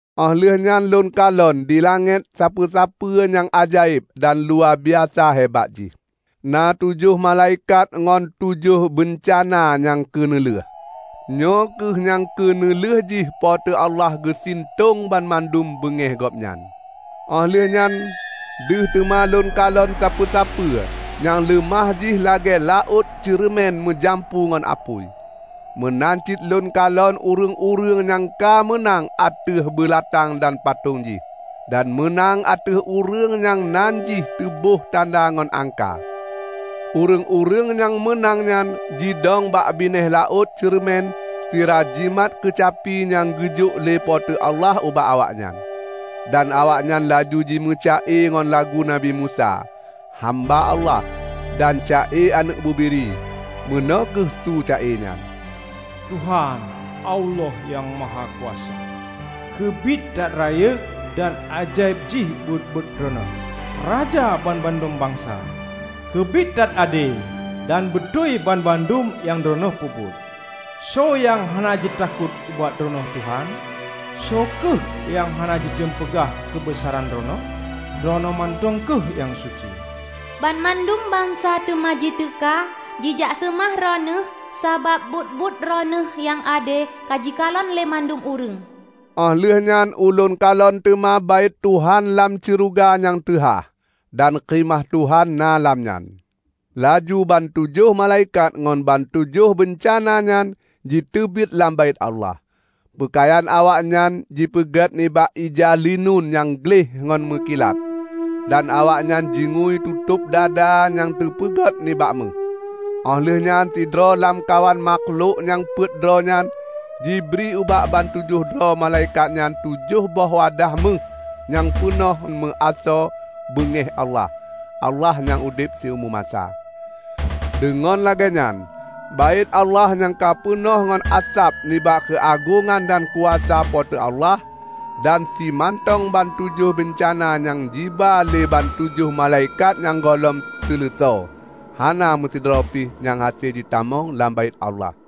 Óh lheueh nyan lôn kalon di langét sapeue-sapeue nyang ajaéb dan luwabiasa hebat jih. Na tujoh malaikat ngon tujoh beuncana nyang keuneulheueh. Nyoe kheueh nyang keuneulheueh jih Po teu Allah geusintong banmandum beungéh Gobnyan. Óh lheueh nyan deuh teuma lôn kalon sapeue-sapeue nyang leumah jih lagée laôt ceureumen meujampu ngon apui. Meunan cit lôn kalon ureuëng-ureuëng nyang ka meunang ateueh beulatang dan patong jih, dan meunang ateueh ureuëng nyang nan jih teuboh tanda ngon angka. Ureuëng-ureuëng nyang meunang nyan jidong bak binéh laôt ceureumen sira jimat keucapi nyang geujok lé Po teu Allah ubak awaknyan. Dan awaknyan laju jimeuca-e ngon lagu Nabi Musa, hamba Allah, dan ca-e Aneuëk Bubiri. Meunoe kheueh su ca-e nyan, "Tuhan, Allah Nyang Mahakuasa, keubiet that rayeuk dan ajaéb jih buet-buet Droeneueh! Raja banmandum bansa, keubiet that ade dan beutôi banmandum nyang Droeneueh peubuet! Soe nyang hana jitakot ubak Droeneueh, Tuhan? Soe kheueh nyang hana jitem peugah keubeusaran Droeneueh? Droeneueh mantong kheueh nyang suci. Banmandum bansa teuma jiteuka jijak seumah Droeneueh sabab buet-buet Droeneueh nyang ade ka jikalon lé mandum ureuëng." Óh lheueh nyan ulôn kalon teuma Baét Tuhan lam syeuruga nyang teuhah, dan Khimah Tuhan na lam nyan. Laju bantujoh malaikat ngon bantujoh beuncana nyan jiteubiet lam Baét Allah. Peukayan awaknyan teupeugét nibak ija linun nyang gleh ngon meukilat. Dan awaknyan jingui tutôb dada nyang teupeugét nibak méuh. Óh lheueh nyan sidroe lamkawan makhlok nyang peuet droe nyan jibri ubak bantujoh droe malaikat nyan tujoh boh wadah méuh nyang peunoh meuasoe beungéh Allah, -- Allah nyang udeb siumu masa. Deungon lagée nyan Baét Allah nyan ka peunoh ngon asab nibak keuagongan dan kuasa Po teu Allah. Dan simantong bantujoh beuncana nyang jiba lé bantujoh malaikat nyan gohlom seuleusoe, hana meusidroe pi nyang hase jitamong lam Baét Allah.